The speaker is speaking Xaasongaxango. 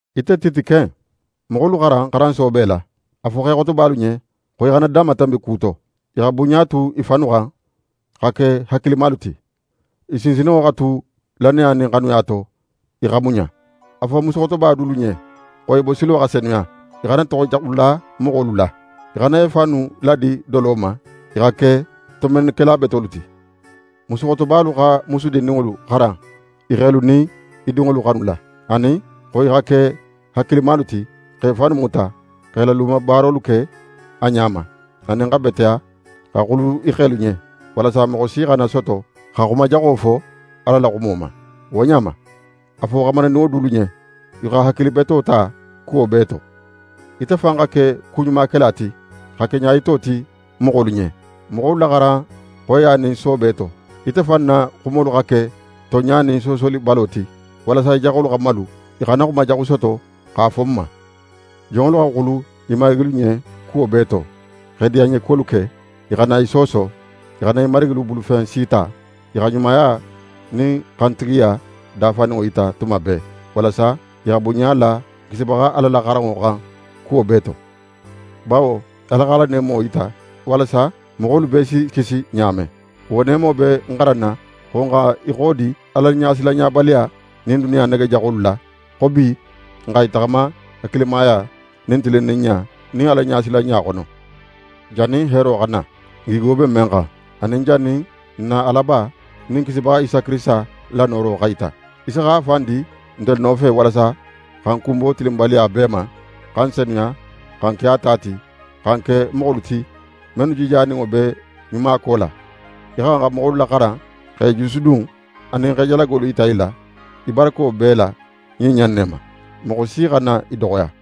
Ite Tite ken, moxolu xaran xaran soobe la. A fo xexotobalu ɲen xo i xana danmatanbi ku to, i xa bunɲa tu i fannu xan, xa ke hakilimalu ti. I sinsinninŋo xa tu lannaya nin xanuya to, i xa muɲa. A fo musuxotoba dulu ɲen xo i bosilo xa senuya. I xana toxo jaxu la moxolu la, i xana i fannu ladi dolo ma. I xa ke tonbennikela betolu ti. Musuxotobalu xa musu dindinŋolu xaran i xelu nin i dinŋolu xanula, anin xo i xa ke hakilimalu ti, x'e fannu muta, x'e la lumabaarolu ke a ɲa ma, anin xa beteya, xa xulu i xelu ɲen, walasa moxo si xana soto xa xumajaxo fo Ala la xumo ma. Wo ɲa ma, a fo xamarindinŋolu dulu ɲen i xa hakili beto ta kuwo bee to. Ite fan xa ke kuɲumakela ti, xa ke ɲayito ti moxolu ɲen. Moxolu laxaran xoyiya nin soobe to. Ite fan na xumolu xa ke tonɲa nin soosolibalo ti, walasa í jaxolu xa malu, i xana xuma jaxu soto x'a fo n ma. Jonŋolu xa xulu i marigilu ɲen kuwo bee to, x'e diyanɲekuwolu ke. I xana i sooso. I xana i marigilu bulufen si ta. I xa ɲumaya nin xantigiya dafaninŋo yita tuma bee, walasa i xa bunɲa la n Kisibaxa Ala la xaranŋo xan kuwo bee to. Bawo Ala x'a la neemo yita, walasa moxolu bee si kisi ɲa men. Wo neemo be n xaranna xo n xa i xodi Alaɲasilanɲabaliya nin duniya nege jaxolu la; xo bi, n xa i taxama hakilimaya nin tilinninɲa nin Alaɲasilanɲa xono, jannin heero xa na, n gigo be men xan, anin jannin n na Alaba nin n Kisibaxa Isa Kirisita la nooro xa yita. Isa x'a fan di ntelu nofe walasa xa n kunbo tilinbaliya bee ma, xa n senuya, xa n ke a ta ti, xa n ke moxolu ti, mennu jijaninŋo be ɲumako la. Í xa xan xa moxolu laxaran, x'e jusudun, anin x'e jalagolu yita i la, í barako bee la ɲin ɲa in ne ma. Moxo si xana í doxoya.